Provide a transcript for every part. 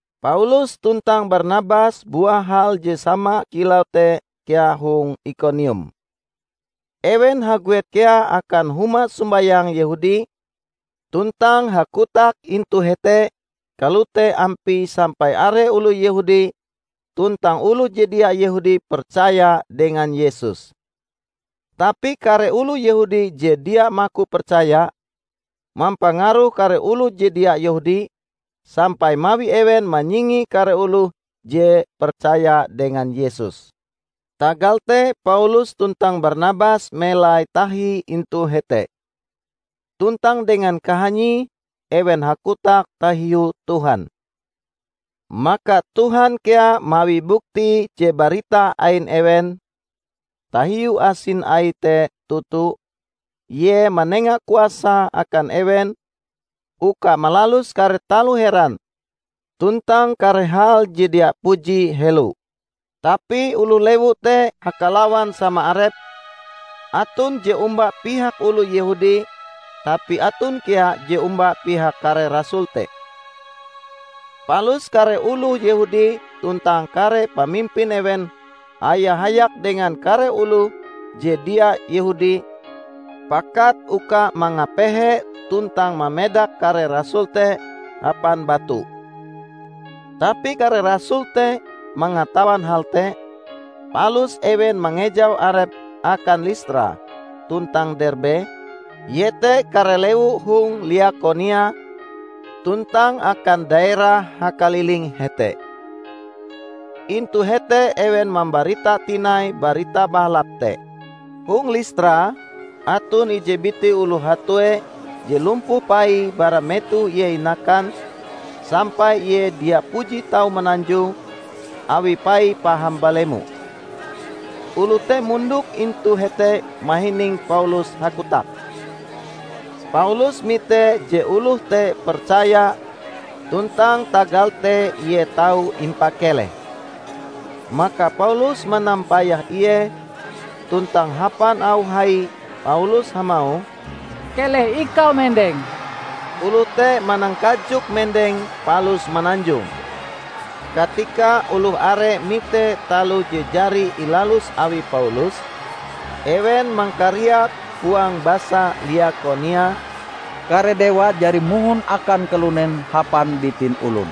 Paulus tuntang Barnabas buah hal je sama kilau te kea hong Ikonium. Ewen haguet kea akan huma sombayang Yehudi tuntang hakotak intu hete kalote ampie sampai are oloh Yehudi tuntang oloh je dia Yehudi percaya dengan Yesus. Tapi kare oloh Yehudi je dia maku percaya, mampangaruh kare oloh je dia Yehudi, sampai mawi ewen manyingi kare oloh je percaya dengan Yesus. Tagal te Paulus tuntang Barnabas melai tahi intu hete. Tuntang dengan kahanyie ewen hakotak tahiu Tuhan. Maka Tuhan kea mawi bukti je barita ain ewen tahiu asin Aie te toto; Ie manenga kuasa akan ewen uka malalus kare taloh heran tuntang kare hal je dia puji helo. Tapi oloh lewu te hakalawan sama arepe; aton je omba pihak oloh Yehudi tapi aton kea je omba pihak kare rasul te. Palus kare oloh Yehudi tuntang kare pamimpin ewen haya-hayak dengan kare oloh je dia Yehudi pakat uka mangapehe tuntang mamedak kare rasul te hapan batu. Tapi kare rasul te mangatawan hal te, palus ewen mangejau arepe akan Listra tuntang Derbe, iete kare lewu hong Liakonia, tuntang akan daerah hakaliling hete. Intu hete ewen mambarita tinai Barita Bahalap te. Hong Listra aton ije biti oloh hatue je lumpuh paie bara metoh ie inakan, sampai ie dia puji tau mananjong, awi paie paham balemo. Oloh te mondok intu hete mahining Paulus hakotak. Paulus mite je oloh te percaya tuntang tagal te ie tau impakeleh. Maka Paulus manampayah ie tuntang hapan auh hai Paulus hamauh, "Keleh ikau mendeng!" Oloh te manangkajok mendeng palus mananjong. Katika oloh are mite taloh je jari ilalus awi Paulus, ewen mangkariak huang basa Liakonia, "Kare dewa jari mohon akan kalunen hapan bitin olon."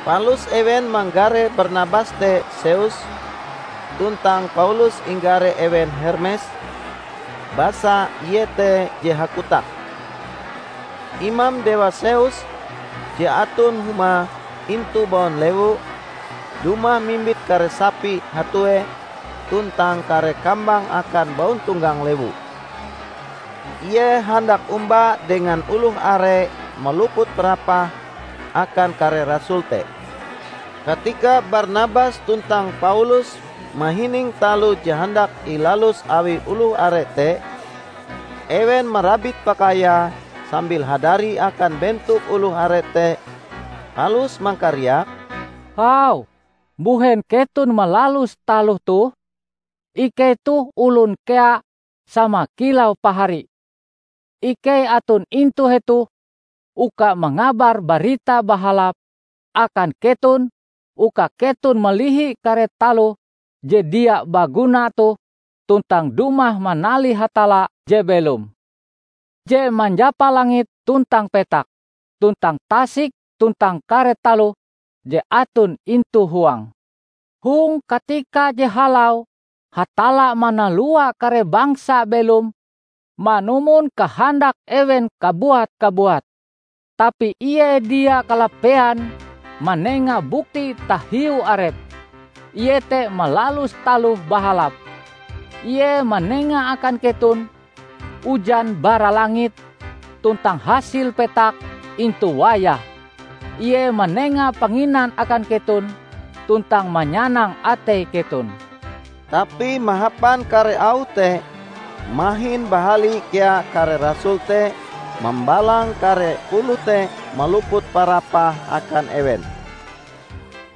Palus ewen manggare Barnabas te Zeus, tuntang Paulus inggare ewen Hermes, basa ie te je hakotak. Imam dewa Zeus, je aton humae intu baun lewu, dumah mimbit kare sapi hatuee tuntang kare kambang akan bauntonggang lewu. Ie handak omba dengan oloh are maluput parapahe akan kare rasul te. Katika Barnabas tuntang Paulus mahining taloh je handak ilalus awi oloh are te, ewen marabit pakaiae sambil hadari akan bentok oloh are te, palus mangkariak, "Hau, mbuhen keton malalus taloh toh? Ikei toh olon kea sama kilau pahari. Ikei aton intu hetoh uka mangabar Barita Bahalap akan keton uka keton malihi kare taloh je dia baguna toh tuntang dumah manalih Hatalla je belom, je manjapa langit tuntang petak, tuntang tasik tuntang kare taloh je aton intu huange. Hong katika je halau Hatalla manalua kare bangsa belom manumon kahandak ewen kabuat-kabuat. Tapi Ie dia kalapean manenga bukti tahiu Arepe, iete malalus taloh bahalap. Ie manenga akan keton ujan bara langit tuntang hasil petak intu wayahe. Ie manenga panginan akan keton tuntang manyanang atei keton." Tapi mahapan kare auh te mahin bahali kea kare rasul te mambalang kare oloh te maluput parapah akan ewen.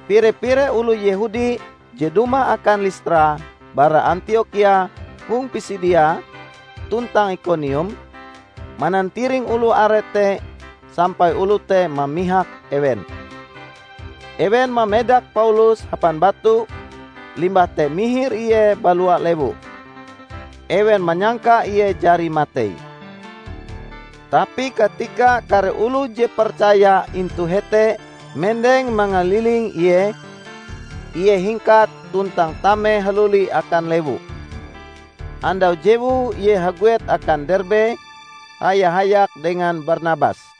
Pire-pire oloh Yehudi je dumah akan Listra bara Antiokhia hong Pisidia tuntang Ikonium, manantiring oloh are te sampai oloh te mamihak ewen. Ewen mamedak Paulus hapan batu, limbah te mihir ie balua lewu. Ewen manyangka ie jari matei. Tapi katika kare oloh je percaya intu hete mendeng mangaliling ie, ie hingkat tuntang tame haluli akan lewu. Andau jewue ie haguet akan Derbe haya-hayak dengan Barnabas.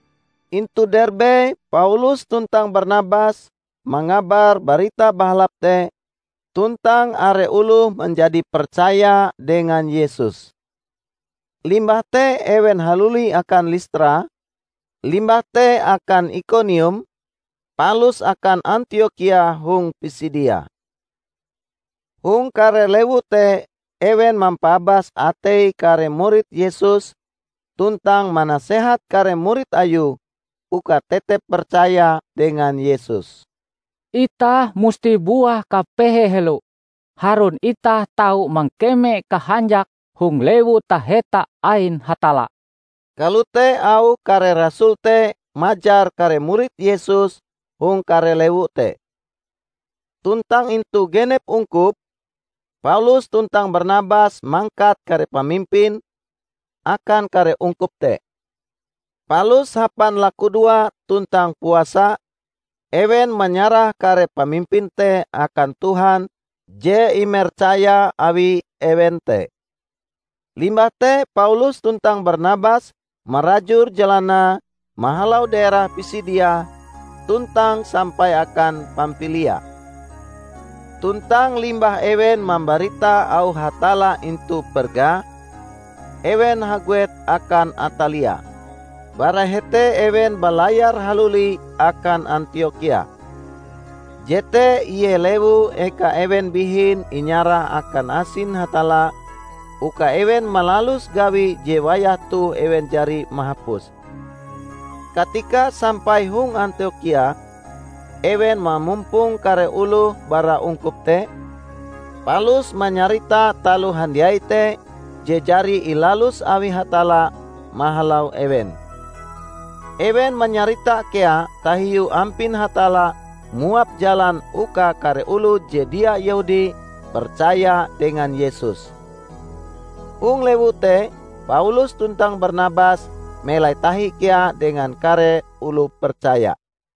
Intu Derbe, Paulus tuntang Barnabas mangabar Barita Bahalap te tuntang are oloh manjadi percaya dengan Yesus. Limbah te ewen haluli akan Listra, limbah te akan Ikonium, palus akan Antiokhia hong Pisidia. Hong kare lewu te ewen mampaabas atei kare murid Yesus tuntang manasehat kare murid Ayue uka tetep percaya dengan Yesus. "Itah musti buah kapehe helo, harun itah tau mangkeme kahanjak hong Lewu Taheta ain Hatalla," kalote auh kare rasul te majar kare murid Yesus hong kare lewu te. Tuntang intu genep ungkup, Paulus tuntang Barnabas mangkat kare pamimpin akan kare ungkup te. Palus hapan lakudoa tuntang puasa, ewen manyarah kare pamimpin te akan Tuhan je imercaya awi ewen te. Limbah te Paulus tuntang Barnabas marajur jalanae mahalau daerah Pisidia tuntang sampai akan Pampilia. Tuntang limbah ewen mambarita auh Hatalla intu Perga, ewen haguet akan Atalia. Bara hete ewen balayar haluli akan Antiokhia. Jete ie lewu eka ewen bihin inyarah akan asin Hatalla, uka ewen malalus gawi je wayah toh ewen jari mahapuse. Katika sampai hong Antiokhia, ewen mamumpong kare oloh bara ungkup te, palus manyarita taloh handiai te je jari ilalus awi Hatalla mahalau ewen. Ewen manyarita kea tahiu ampin Hatalla muap jalan uka kare oloh je dia Yehudi percaya dengan Yesus. Hong lewu te Paulus tuntang Barnabas melai tahi kea dengan kare oloh percaya.